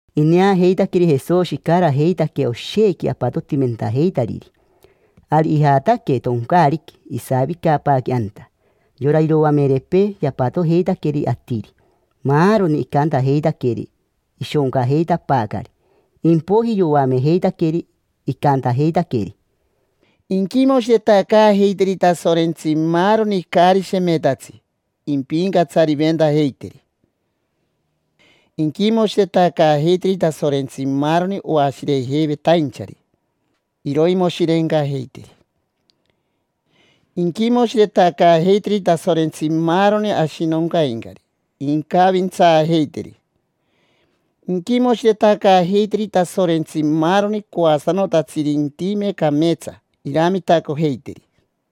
Ineajeitaqueri Jesoshi icarajeitaque oshequi apatotimentajeitariri, ari ijataque toncaariqui, isavicapaaque anta. Yora iroamerepee yapatojeitaqueri atiri, maaroni. Icantajeitaqueri ishoncajeitapaacari. Impoiji yoamejeitaqueri, icantajeitaqueri: —Inquimoshiretacaajeiteri Tasorentsi maaroni caari shemetatsi, impincatsariventajeiteri. Inquimoshiretacaajeiteri Tasorentsi maaroni oashirejeivetainchari, iroimoshirencajeiteri. Inquimoshiretacaajeiteri Tasorentsi maaroni ashinoncaincari, incavintsaajeiteri. Inquimoshiretacaajeiteri Tasorentsi maaroni coasanotatsiri intime cameetsa, iramitacojeiteri.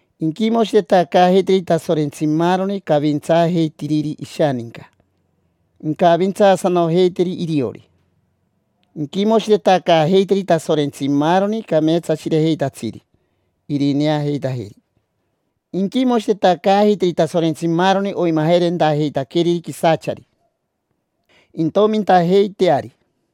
Inquimoshiretacaajeiteri Tasorentsi maaroni cavintsaajeitiriri ishaninca, incavintsaasanojeiteri iriori. Inquimoshiretacaajeiteri Tasorentsi maaroni cameetsashirejeitatsiri, irineajeitajeri. Inquimoshiretacaajeiteri Tasorentsi maaroni oimajerentajeitaqueriri quisachari, intomintajeiteari.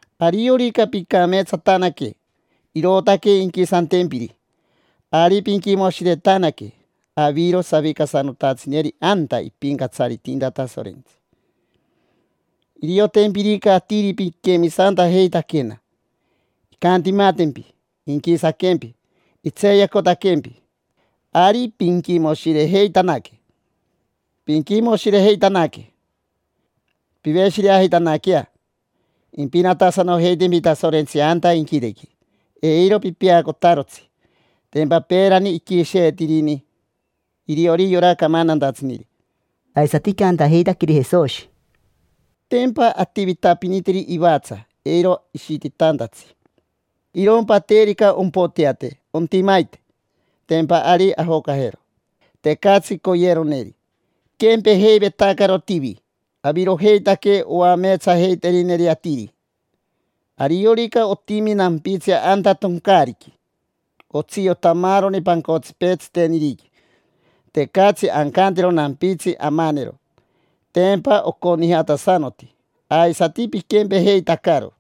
Ariorica pincameetsatanaque, irootaque inquisantempiri, ari pinquimoshiretanaque: aviro savicasanotatsineri anta ipincatsaritinta Tasorentsi. Iriotempirica atiri piquemisantajeitaquena, incantimatempi, inquisaquempi, intseeyacotaquempi. Ari pinquimoshirejeitanaque. Pinquimoshirejeitanaque, piveshireajeitanaquea: impinatasanojeitempi Tasorentsi anta inquitequi. Eiro pipeacotarotsi: tempa peerani iquisheetirini iriori yora camantantatsiniri. Aisati icantajeitaqueri Jesoshi: —Tempa ativitapinitiri ivatsa eiro ishititantatsi. Irompa terica ompoteate, ontimaite: tempa ari ajocajero, tecatsi coyeroneri. Piquempejeivetacaro tivi: avirojeitaque oameetsajeiterineri atiri. Ariorica otimi nampitsi anta toncaariqui, otsiota maaroni pancotsipee tsiteniriqui. Tecatsi ancantero nampitsi amanero, tempa oconijatasanoti. Aisati piquempejeitacaro,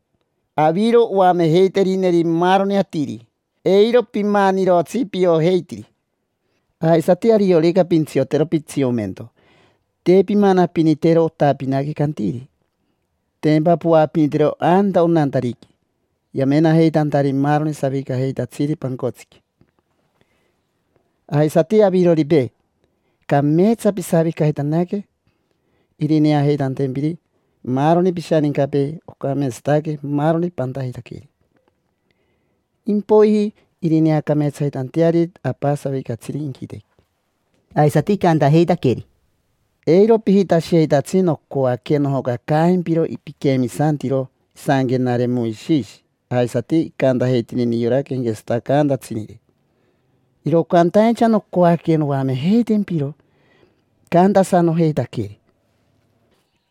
aviro oamejeiterineri maaroni atiri: eiro pimanirotsi piojeitiri. Aisati, ariorica pintsiotero pitsiomento, te pimanapiniteroji otapinaqui cantiri. Tempa poapinitiro anta onantariqui yamenajeitantari maaroni savicajeitatsiri pancotsiqui. Aisati aviroripee, cameetsa pisavicajeitanaque irineajeitantempiri maaroni pishanincapee ocameetsataque maaroni pantajeitaqueri. Impoiji irineacameetsajeitanteariri Apa savicatsiri inquitequi. Aisati icantajeitaqueri: —Eiro pijitashijeitatsi nocoaque nojocacaajempiro piquemisantiro isanquenare Moishishi aisati icantajeitiniri yora quenquetsatacaantatsiniri. Iro cantaincha nocoaque noamejeitempiro icantasanojeitaqueri.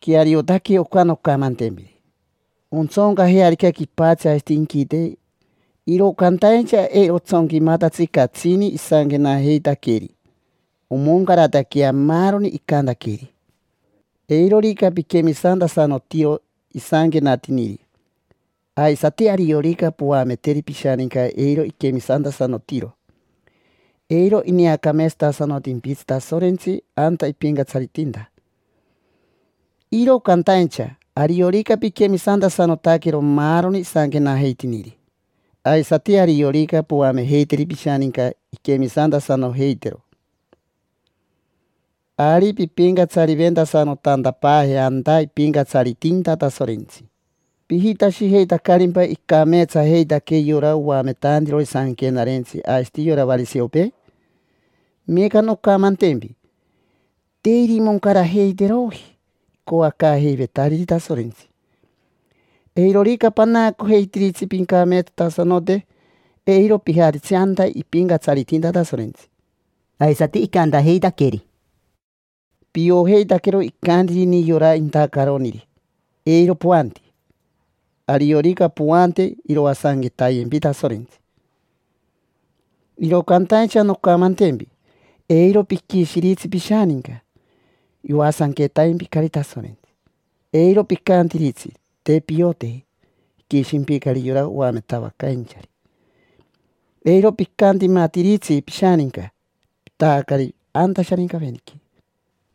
Queariotaque oca noncamantempiri: ontsoncajearica quipatsi aisati inquite, iro cantaincha eiro otsonquimatatsi catsini isanquenajeitaqueri. Omoncarataquea maaroni icantaqueri. Eirorica piquemisantasanotiro isanquenatiniri, aisati ariorica poameteri pishaninca eiro iquemisantasanotiro, eiro ineacameetsatasanotimpitsi Tasorentsi anta ipincatsaritinta. Iro cantaincha ariorica pinquemisantasanotaquero maaroni isanquenajeitiniri, aisati ariorica poamejeiteri pishaninca inquemisantasanojeitero, ari pimpincatsariventasanotantapaaje anta ipincatsaritinta Tasorentsi. ¿Pijitashijeitacarimpa icameetsajeitaque yora oametantirori sanquenarentsi aisati yora variseopee? Meeca noncamantempi: te irimoncarajeiteroji icoacaajeivetariri Tasorentsi. Eirorica panaacojeitiritsi pincameetsatasanote, eiro pijatitsi anta ipincatsaritinta Tasorentsi. Aisati icantajeitaqueri: —Piojeitaquero icantiniri yora intacaroniri: “Eiro poanti. Ariorica poante, iroasanquetayempi Tasorentsi”. Iro cantaincha noncamantempi: eiro piquishiritsi pishaninca: yoasanquetaimpicari Tasorentsi. Eiro picantiritsi: “Te pioteji”: iquishimpicari yora oametavacainchari. Eiro picantimatiritsi pishaninca: pitaacari anta Sharincaveniqui.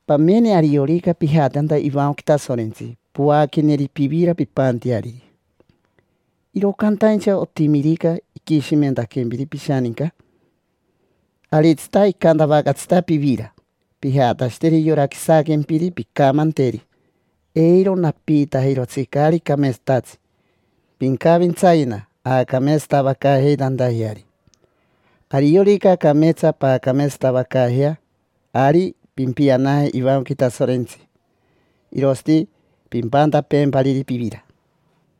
Pamene, ariorica pijate anta ivancoqui Tasorentsi poaqueneri pivira pimpanteariri; iro cantaincha otimirica iquishimentaquempiri pishaninca, aritsita icantavacatsita pivira, pijatashiteri yora quisaquempiri. Pincamanteri: “Eiro napiitajirotsi caari cameetsatatsi. Pincavintsayena aacameetsatavacaajeitantajeari”. Ariorica cameetsa paacameetsatavacaajea, ari pimpianaje ivancoqui Tasorentsi, irosati pimpantapeempariri pivira.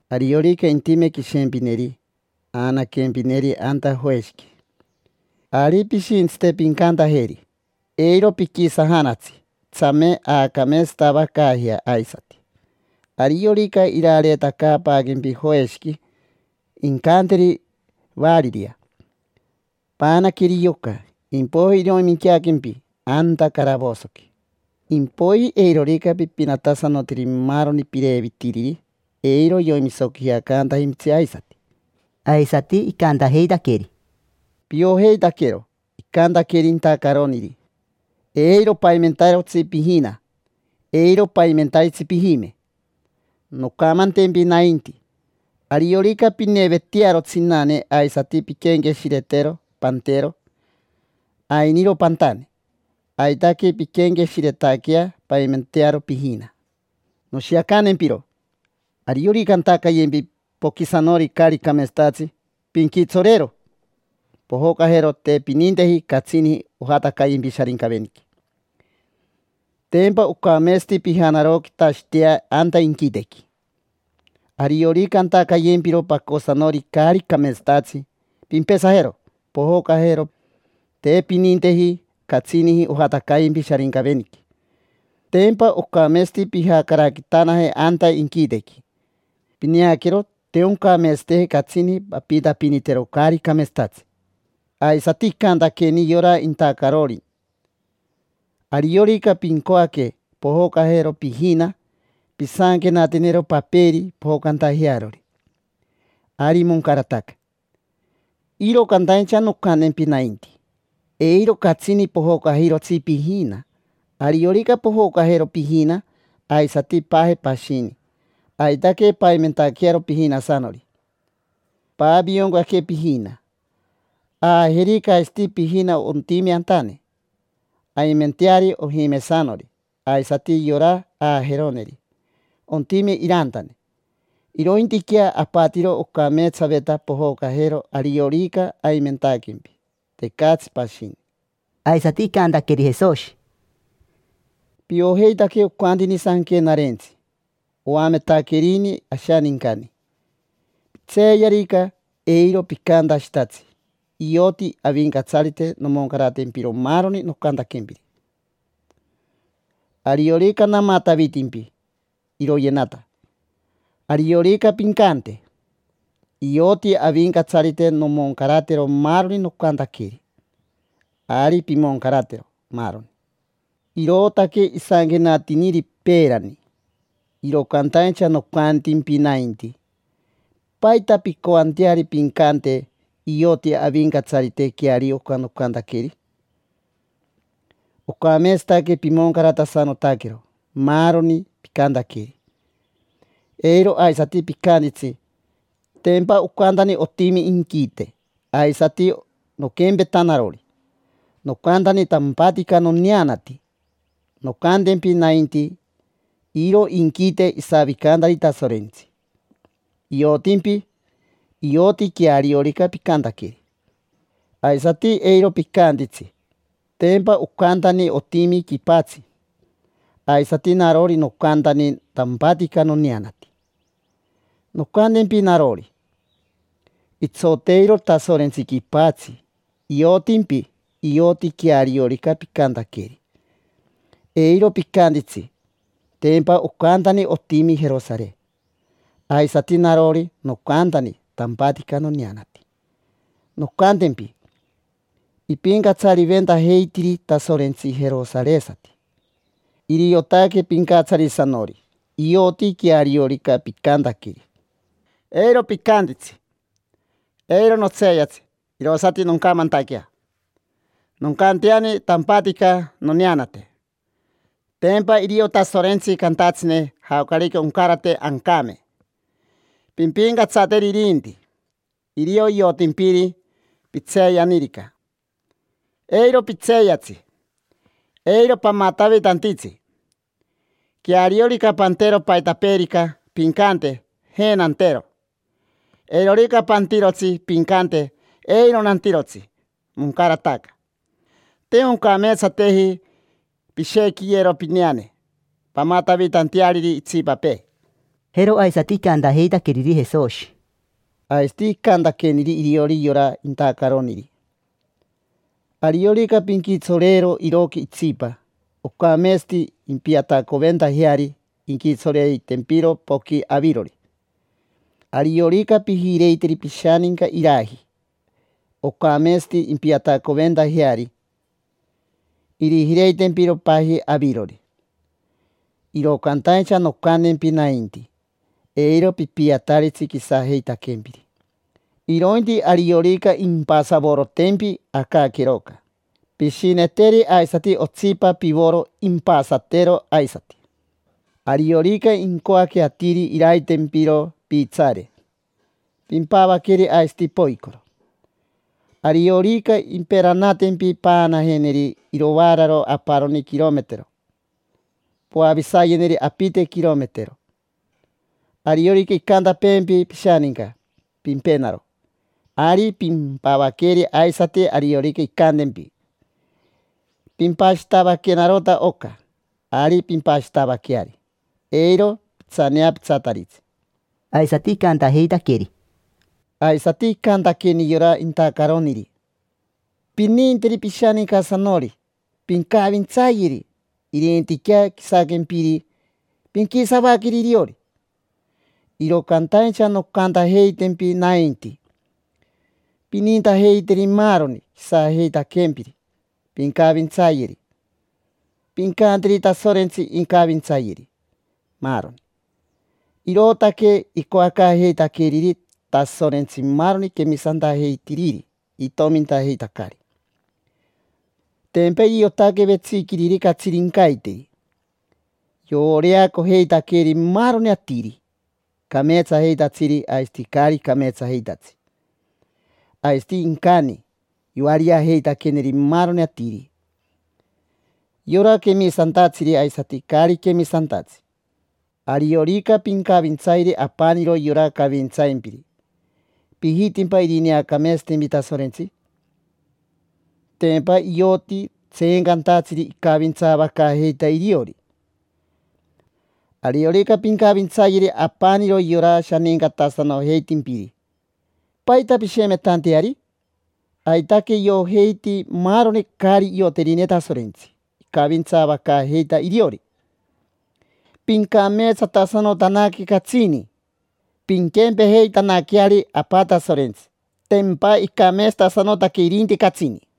Ariorica intime quishempineri aanaquempineri anta joeshiqui. Ari pishintsite pincantajeri: “Eiro piquisajanatsi, tsame aacameetsatavacaajea aisati”. Ariorica irareetacaapaaquempi joeshiqui, incanteri variria: “Paanaqueri yoca”, impoiji iroiminqueaquempi anta caravosoqui. Impoiji eirorica pipinatasanotiri maaroni pirevitiriri, eiro yoimisoquijacantajimpitsi aisati. Aisati icantajeitaqueri: —Piojeitaquero icantaqueri intacaroniri: “Eiro paimentarotsi pijina, eiro paimentaritsi pijime”. Noncamantempi nainti: ariorica pinevetearo tsinane aisati pinquenqueshiretero pantero, ainiro pantane; aitaque pinquenqueshiretaquea paimentearo pijina. Noshiacantempiro: ariorica antacayempi poquisanori caari cameetsatatsi, pinquitsoreero, pojocajero. Te pininteji catsini ojatacayempi Sharincaveniqui. Tempa ocameetsati pijanaroquitashitea anta inquitequi. Ariorica antacayempiro pacosanori caari cameetsatatsi, pimpesajero, pojocajero. Te pininteji catsini ojatacayempi Sharincaveniqui. Tempa ocameetsati pijacaraquitanaje anta inquitequi. Pineaquero, te oncameetsateji catsini pampiitapinitero caari cameetsatatsi. Aisati icantaqueni yora intacarori: “Ariorica pincoaque pojocajero pijina, pisanquenatenero paperi pojocantajearori, ari moncarataca”. Iro cantaincha noncantempi nainti: eiro catsini pojocajirotsi pijina. Ariorica pojocajero pijina, aisati paaje pashini, aitaque paimentaquearo pijinasanori: paavioncaque pijina. Aajerica aisati pijina ontime antane: aimenteari ojimesanori. Aisati yora aajeroneri, ontime irantane. Irointiquea apatiro ocameetsaveta pojocajero ariorica aimentaquempi, tecatsi pashini. Aisati icantaqueri Jesoshi: —Piojeitaque ocantini Sanquenarentsi. Oametaquerini ashanincani: “Pintseeyarica, eiro picantashitatsi: ‘Ioti Avincatsarite nomoncaratempiro maaroni nocantaquempiri. Ariorica namatavitimpi, iroyenata’. Ariorica pincante: ‘Ioti Avincatsarite nomoncaratero maaroni nocantaqueri’, ari pimoncaratero, maaroni”. Irootaque isanquenatiniri peerani. Iro cantaincha nocantimpi nainti: ¿paita pincoanteari pincante: “Ioti Avincatsarite queario oca nocantaqueri”? Ocameetsataque pimoncaratasanotaquero maaroni picantaqueri. Eiro aisati picantitsi: “Tempa ocantani otimi inquite, aisati noquempeta narori, nocantani tampatica noneanati”. Noncantempi nainti: iro inquite isavicantari Tasorentsi; iotimpi, ioti queariorica picantaqueri. Aisati eiro picantitsi: “Tempa ocantani otimi quipatsi, aisati narori nocantani tampatica noneanati”. Noncantempi narori: itsoteiro Tasorentsi quipatsi, iotimpi; ioti queariorica picantaqueri. Eiro picantitsi: “Tempa ocantani otimi Jerosare, aisati narori nocantani tampatica noneanati”. Noncantempi: ipincatsariventajeitiri Tasorentsi jerosaresati, iriotaque pincatsarisanori. Ioti queariorica picantaqueri. Eiro picantitsi: “Eiro notseeyatsi, irosati noncamantaquea, noncanteani tampatica noneanate”. Tempa irio Tasorentsi cantatsine jaocarica oncarate ancame. Pimpincatsateri irinti, irio iotimpiri pitseeyanirica. Eiro pitseeyatsi, eiro pamatavitantitsi. Queariorica pantero paitapeerica, pincante: “Je, nantero”. Eirorica pantirotsi, pincante: “Eiro nantirotsi”. Moncarataca. Te oncameetsateji pishequiyero pineane pamatavitanteariri itsipapee. Jero aisati icantajeitaqueriri Jesoshi: —Aisati icantaqueniri iriori yora intacaroniri: “Ariorica pinquitsoreero iroqui itsipa, ocameetsati impiatacoventajeari inquitsoreitempiro poqui avirori. Ariorica pijireiteri pishaninca iraji, ocameetsati impiatacoventajeari, irijireitempiro paji avirori”. Iro cantaincha noncantempi nainti: eiro pipiataritsi quisajeitaquempiri, irointi ariorica impasavorotempi acaqueroca, pishineteri aisati otsipa pivoro impasatero aisati. Ariorica incoaque atiri iraitempiro piitsaare, pimpavaqueri aisati poicoro. Ariorica imperanatempi paanajeneri irovaararo aparoni quirometero, poavisayeneri apite quirometero. Ariorica incantapeempi pishaninca: “Pimpenaro”, ari pimpavaqueri. Aisati, ariorica incantempi: “Pimpashitavaquenarota oca”, ari pimpashitavaqueari, eiro pitsaneapitsataritsi. Aisati icantajeitaqueri: —Aisati icantaqueni yora intacaroniri: “Pininteri pishanincasanori, pincavintsayeri. Irintiquea quisaquempiri, pinquisavaqueri iriori”. Iro cantaincha noncantajeitempi nainti: pinintajeiteri maaroni quisajeitaquempiri, pincavintsayeri, pincanteri Tasorentsi incavintsayeri, maaroni. Irootaque icoacaajeitaqueriri Tasorentsi maaroni quemisantajeitiriri itomintajeitacari. Tempa iriotaque vetsiquiriri catsirincaiteri: yovoreacojeitaqueri maaroni atiri, cameetsajeitatsiri aisati caari cameetsajeitatsi. Aisati incani, yoariajeitaqueneri maaroni atiri: yora quemisantatsiri aisati caari quemisantatsi. Ariorica pincavintsayeri apaniro yora cavintsaimpiri, ¿pijitimpa irineacameetsatempi Tasorentsi? Tempa ioti tseencantatsiri icavintsaavacaajeita iriori. Ariorica pincavintsayeri apaniro yora shanincatasanojeitimpiri, ¿paita pishemetanteari? Aitaque iojeiti maaroni caari ioterine Tasorentsi icavintsaavacaajeita iriori. Pincameetsatasanotanaque catsini, pinquempejeitanaqueari Apa Tasorentsi: tempa icameetsatasanotaque irinti catsini.